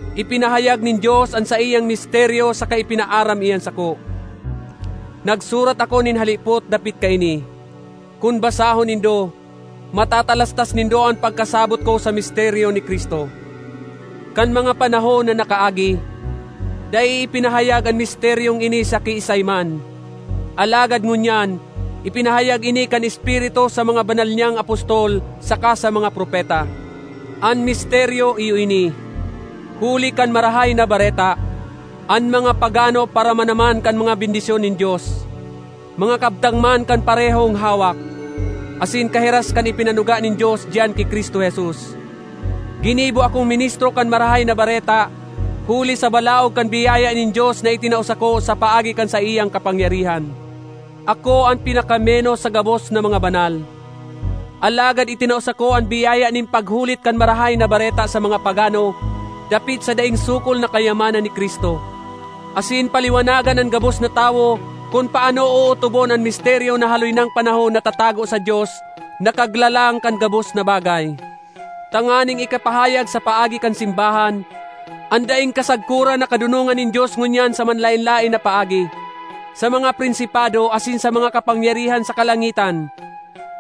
Ipinahayag nin Dios an saiyang misteryo saka ipinaaram iyan sako. (Nagsurat ako nin halipot dapit kaini; kun basahon nindo, matatalastas nindo an pagkasabot ko sa misteryo ni Cristo.) Kan mga panahon na nakaagi, dai ipinahayag an misteryong ini sa kiisay man, alagad ngunyan ipinahayag ini kan Espiritu sa mga banal niyang apostol saka sa mga propeta. An misteryo iyo ini: huli kan Marahay na Bareta, an mga pagano paramana man kan mga bendisyon nin Dios; mga kabtang man kan parehong hawak, asin kahiras kan ipinanuga nin Dios diyan ki Cristo Jesus. Ginibo akong ministro kan Marahay na Bareta huli sa balaog kan biyaya nin Dios na itinao sako sa paagi kan saiyang kapangyarihan. Ako an pinakamenos sa gabos na mga banal. Alagad itinao sako an biyaya nin paghulit kan Marahay na Bareta sa mga pagano dapit sa daing sukol na kayamanan ni Cristo, asin paliwanagan an gabos na tawo kun paano ootobon an misteryo na haloy nang panahon natatago sa Dios na Kaglalang kan gabos na bagay; tanganing ikapahayag sa paagi kan simbahan, an daing kasagkoran na kadonongan nin Dios ngunyan sa manlaen-laen na paagi, sa mga prinsipado asin sa mga kapangyarihan sa kalangitan.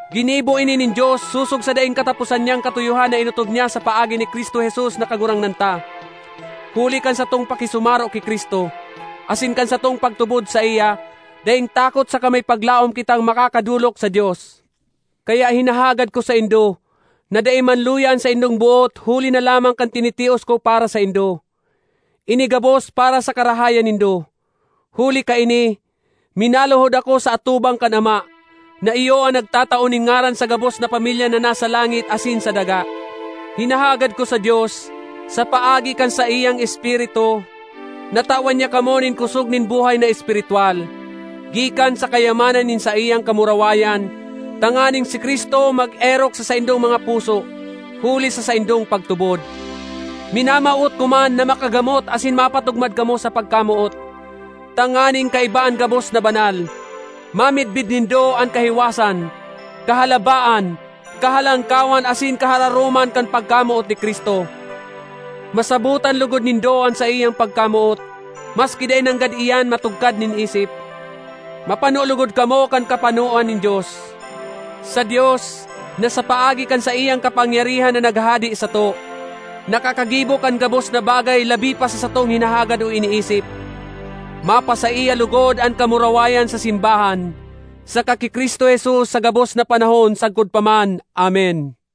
Ginibo ini nin Dios sosog sa daing kataposan niyang katuyohan na inotob niya sa paagi ni Cristo Jesus na Kagurangnan ta. Huli kan satong pakisumaro ki Cristo, asin kan satong pagtubod saiya, daing takot saka may paglaom kitang makakadolok sa Dios. Kaya hinahagad ko saindo na dai manluya an saindong boot huli na lamang kan tinitios ko para saindo; ini gabos para sa karahayan nindo. Huli kaini, minaluhod ako sa atubang kan Ama, na iyo an nagtatao nin ngaran sa gabos na pamilya na nasa langit asin sa daga. Hinahagad ko sa Dios, sa paagi kan saiyang Espiritu, na tawan niya kamo nin kosog nin buhay na espiritwal, gikan sa kayamanan nin saiyang kamurawayan, tanganing si Cristo mag-erok sa saindong mga puso, huli sa saindong pagtubod. Minamawot ko man na makagamot asin mapatugmad kamo sa pagkamoot, tanganing kaiba an gabos na banal, mamidbid nindo an kahiwasan, kahalabaan, kahalangkawan asin kahararoman kan pagkamoot ni Cristo. Masabotan logod nindo an saiyang pagkamoot—maski dai nanggad iyan matugkad nin isip. Mapano logod kamo kan kapanoan nin Dios. Sa Dios, na sa paagi kan saiyang kapangyarihan na naghahade sato nakakagibo kan gabos na bagay labi pa sa satong hinahagad o iniisip, mapasaiya logod an kamurawayan sa simbahan, saka ki Cristo Jesus sa gabos na panahon sagkod pa man! Amen.